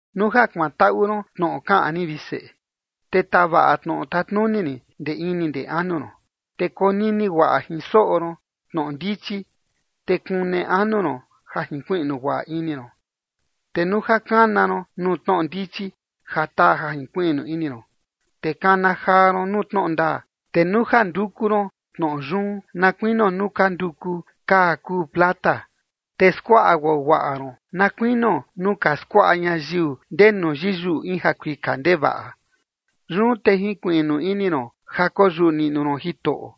Nuu ja kuantaꞌu ron tnoꞌo kaꞌan rin, vi seꞌe, te tavaꞌa tnoꞌo tatnuni rin ndee ini ndee anu ron, te konini guaꞌa jin soꞌo ron tnoꞌo ndichi, te kune anu ron ja junkuiꞌnu guaꞌa ini ron, te nuu ja kana ron nuu tnoꞌo ndichi ja taa ja junkuiꞌnu ini ron, te kana jaa ron nuu tnoꞌo ndaa, te nuu ja nduku ron tnoꞌo yun na kuinio nuu ka nduku kaa kuu plata, te skuaꞌa guaguaꞌa ron na kuinio nuu ka skuaꞌa ñayiu ndenu yiyuꞌu in jakuika ndevaꞌa, yun te junkuiꞌnu ini ron ja koyuꞌu niꞌnu ron Jitoꞌo,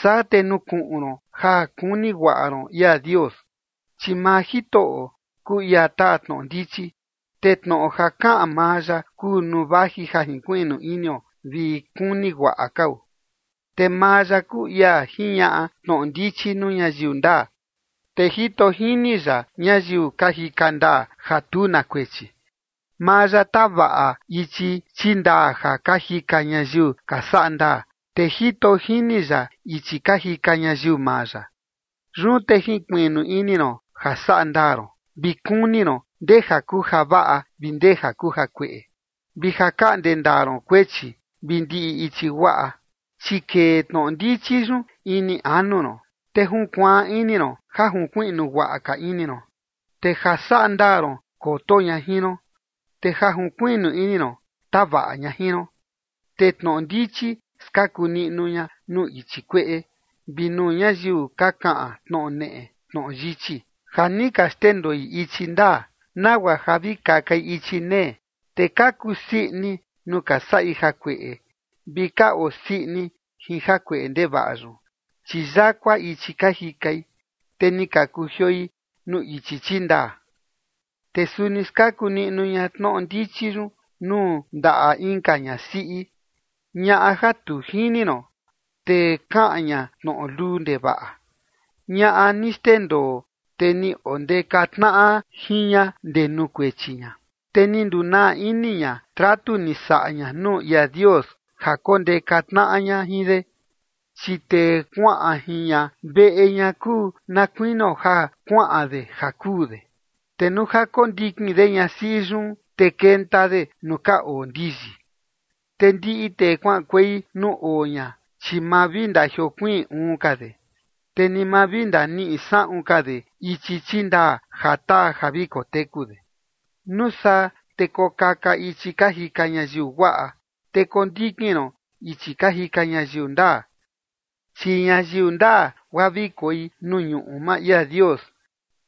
saa te nukuꞌun ron ja kuni guaꞌa ron ia Dios. Chi maa Jitoꞌo kuu ia taa tnoꞌo ndichi, te tnoꞌo ja kaꞌan maa ya kuu nuu vaji ja jinkuiꞌnu inio vi kuni guaꞌa kao. Te maa ya kuu ia jiñaꞌa tnoꞌo ndichi nuu ñayiu ndaa, te jito jini ya ñayiu ka jika ndaa, ja tu na kuechi. Maa ya tavaꞌa ichi chindaa ja ka jika ñayiu ka saꞌa ndaa, te jito jini ya ichi ka jika ñayiu maa ya. Yun te junkuiꞌnu ini ron ja saꞌa ndaa ron, vi kuni ron ndee ja kuu javaꞌa vi ndee ja kuu jakueꞌe, vi ja kaꞌnde ndaa ron kuechi vi ndiꞌi ichi guaꞌa. Chi kee tnoꞌo ndichi yun ini anu ron, te junkuaan ini ron ja junkuiꞌnu guaꞌa ka ini ron. Te ja saꞌa ndaa ron koto ña jin ron, te ja junkuiꞌnu ini ron tavaꞌa ña jin ron. Te tnoꞌo ndichi skaku niꞌnu ña nuu ichi kueꞌe, vi nuu ñayiu ka kaꞌan tnoꞌo neꞌe tnoꞌo yichi, ja ni ka xndendoi ichi ndaa, nagua ja vi kakai ichi nee. Te ka kusii ini nuu ka saꞌi jakueꞌe vi ka osii ini jin jakueꞌe ndevaꞌa yun. Chi yakua ichi ka jikai, te ni ka kujioi nuu ichi chindaa. Te suni skaku niꞌnu ña tnoꞌo ndichi yun nuu ndaꞌa inka ñasiꞌi, ñaꞌa ja tu jini ron, te kaꞌan ña tnoꞌo luu ndevaꞌa, ñaꞌa ni xndendoo tee ni ondeka tnaꞌa jin ña ndee nuu kuechi ña, te ni ndunaa ini ña tratu ni saꞌa ña nuu ia Dios ja kondeka tnaꞌa ña jin de. Chi tee kuaꞌan jin ña veꞌe ña kuu na kuinio ja kuaꞌan de ja kuu de, te nuu ja kondikin de ñasiꞌi yun, te kenta de nuu ka oo ndiyi. Te ndiꞌi tee kuaꞌankuei nuu oo ña, chi ma vi ndajiokuiin uun ka de, te ni ma vi ndaniꞌi saꞌun ka de ichi chindaa ja taa ja vi koteku de. Nuu saa, te kokaka ichi ka jika ñayiu guaꞌa, te kondikin ron ichi ka jika ñayiu ndaa. Chi ñayiu ndaa, guaa vi koi nuu ñuꞌu maa ia Dios,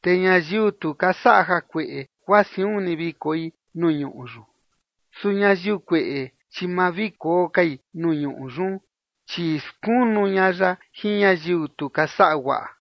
te ñayiu tu ka saꞌa jakueꞌe, guaa siun ni vi koi nuu ñuꞌu yun. Su ñayiu kueꞌe, chi ma vi koo kai nuu ñuꞌu yun, chi skunu ña ya jin ñayiu tu ka saꞌa guaꞌa.